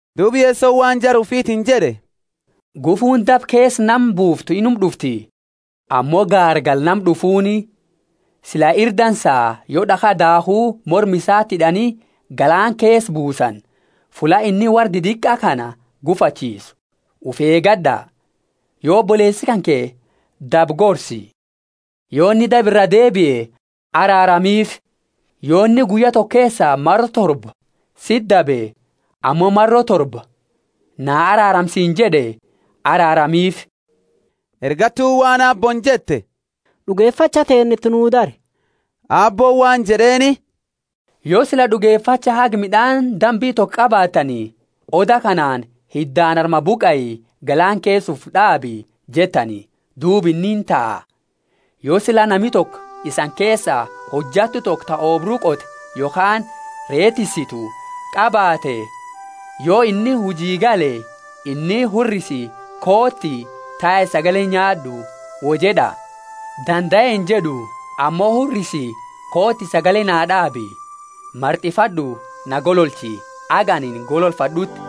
Duuba Yesoni waan jara ufitiini jed'e, Gufuuni daba keesa nama buuftu inuma d'ufti, ammo gaargala nama d'ufuuni! Sila ira dansa yo daakha daakhu morma isaati hid'ani galaana keesa buusani, fulla inni worra didiqa kana gufachiisu. Ufi eegad'a! Yo oboleesi kanke dabe gorsi, yo inni daba iraa deebie araaramiifi. Yo inni guyya toko keesa maro torba siti dabe ammo maro torba, Na araarami siini jed'e, araaramiifi. Ergattuuni waan Aabbooni jette, D'ugefacha teenna iti nuu dari. Aabbooni waan jed'eeni, Yo sila d'ugefacha haga mid'aani dambi toko qabaattani, oda kanaani, Hiddaani armaa buqai, galaana keesa ufi d'aabi, jettani, duuba inni intaha. Yo sila nami toko isani keesa hojattu toko ta oobru qote yokhaani ree tissitu qabaate, yo inni huji gale, inni, Hurrisi, kooti, tai sagale nyaad'u wo jed'a? Dandae injed'u, ammo, Hurrisi, kooti, sagale naa d'aabi, mart'ifad'u na golochi, haga anini gololfad'uuti;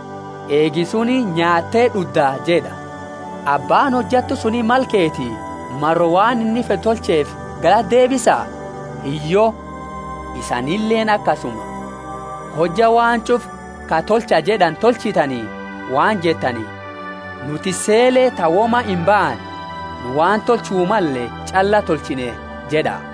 eegi suni nyaatte d'udda jed'a. Abbaani hojattu suni mala keeti maro waan inni fed'u tolcheefi galata deebisa? Hiyyo. Isanileeni akasuma; hojja waan ch'ufa ka Tolcha jed'ani tolchitani, waan jettani, Nu tissele ta woma imbaane; nu waan tolchu malle ch'alla tolchine jed'a.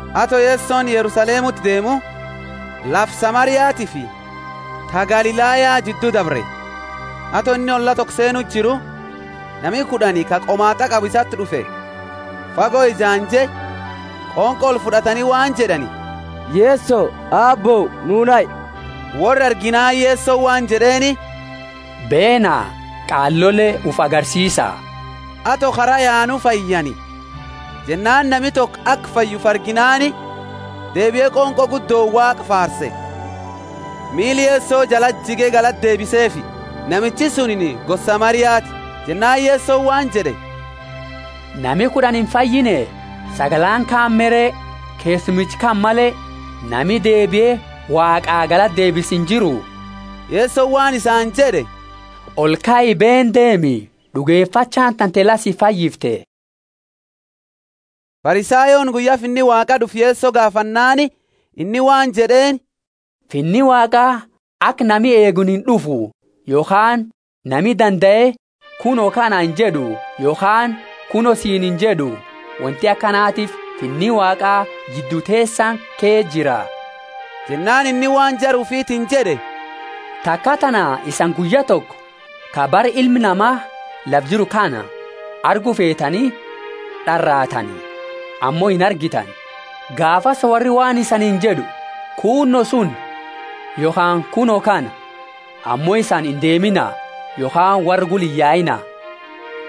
Ato Yesoni Yerusalemuti deemu, lafa Samariatifi ta Galilaya jiddu dabre. Ato inni olla toko seenu jiru, nami kud'ani ka qomaat'a qabu isati d'ufe, fago ejaanje, qonqo olfud'atani waan jed'ani, Yeso, Aabbo, nu nahi. Worra arginaani Yesoni waan jed'eeni, Beena, qaalole ufi agarsiisa. Ato kara yaanu fayyani. Jennaani nami toko aka fayye ufi arginaani, deebie qonqo guddooni Waaqa faarse. Miila Yeso jalati jige galata deebiseefi. Namichi sunini gosa Samariati. Jennaani Yesoni waan jed'e, Nami kud'ani imfayine? Sagalaani kaani me re? Keessumicha kana male, nami deebie Waaqa galata deebisu injiru? Yesoni waan isaani jed'e, Olkai, beeni deemi, d'ugefachaani tante la si fayyifte. Farisayooni guyya Finni Waaqa d'ufu Yeso gaafannaani inni waan jed'eeni, Finni Waaqa aka nami eeguuni ind'ufu. Yokhaani nami dandae, Kuno kana injed'u, yokhaani, Kuno suni injed'u. Wonti akanatiifi Finni Waaqa jiddu teesani ke jira. Jennaani inni waan jara ufiitini jed'e, taka tana isani guyya toko ka bara Ilmi Nama lafa jiru kaani argu feetani d'araatani, ammo inargitani. Gaafasi worri waan isaniini jed'u kuno suni yokhaani kuno kana. Ammo isani indeemina Yokhaani worra gula iyyaina.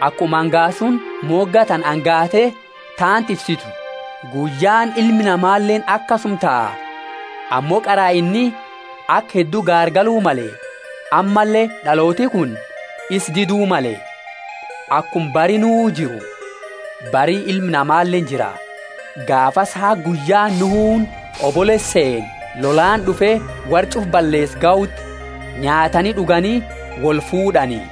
Akuma angaasuni moga tana angaate taanti ifsitu, guyyaani Ilma Namaleeni akasuma taha. Ammo qara inni aka heddu gaargalu male, ammalle d'alooti kuni isa didu male. Akuma bari Nuhu jiru, bari Ilma Namaleeni jira. Gaafasi haga guyyaani Nuhuni hobolo seene lolaani d'ufe worra ch'ufa balleese gahuti, nyaatani d'ugani wolfuud'ani.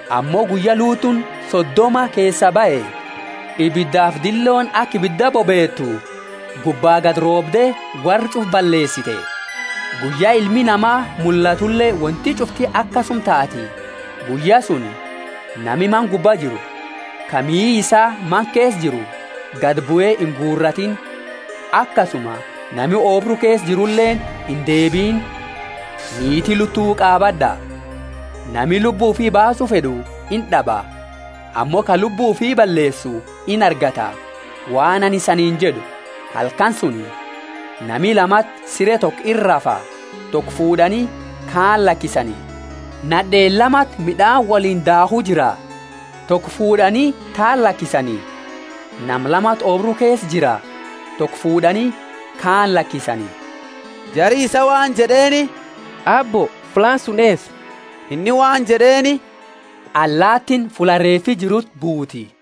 Ammo guyya Lutuuni Sodoma keesaa bahe, ibidafi dillooni aka ibida bobeetu gubba gadi roobde worra ch'ufa balleesite. Guyya Ilmi Nama mullatule wonti ch'ufti akasuma taati. Guyya suni, nami mana gubba jiru, ka mihi isaa mana keesa jiru, gadi bue inguuratiini; akasuma nami oobru keesa jiruleeni indeebiini. Niiti Lutu qaabad'a! Nami lubbu ufi baasu fed'u ind'aba; ammo ka lubbu ufii balleesu inargata. Waan anini isaniini jed'u, Halkani suni nama lamati sire toko ira rafa: toko fuud'ani, kaani lakisani. Nad'eeni lamati mid'aani woliini daakhu jira; toko fuud'ani, taani lakisani. [ Nama lamati oobru keesa jira: toko fuud'ani, kaani lakisani.] Jari isaa waan jed'eeni, Aabbo, fullaani suni eesa? Inni waan jed'eeni, Allaatiini fulla reefi jiruti buuti.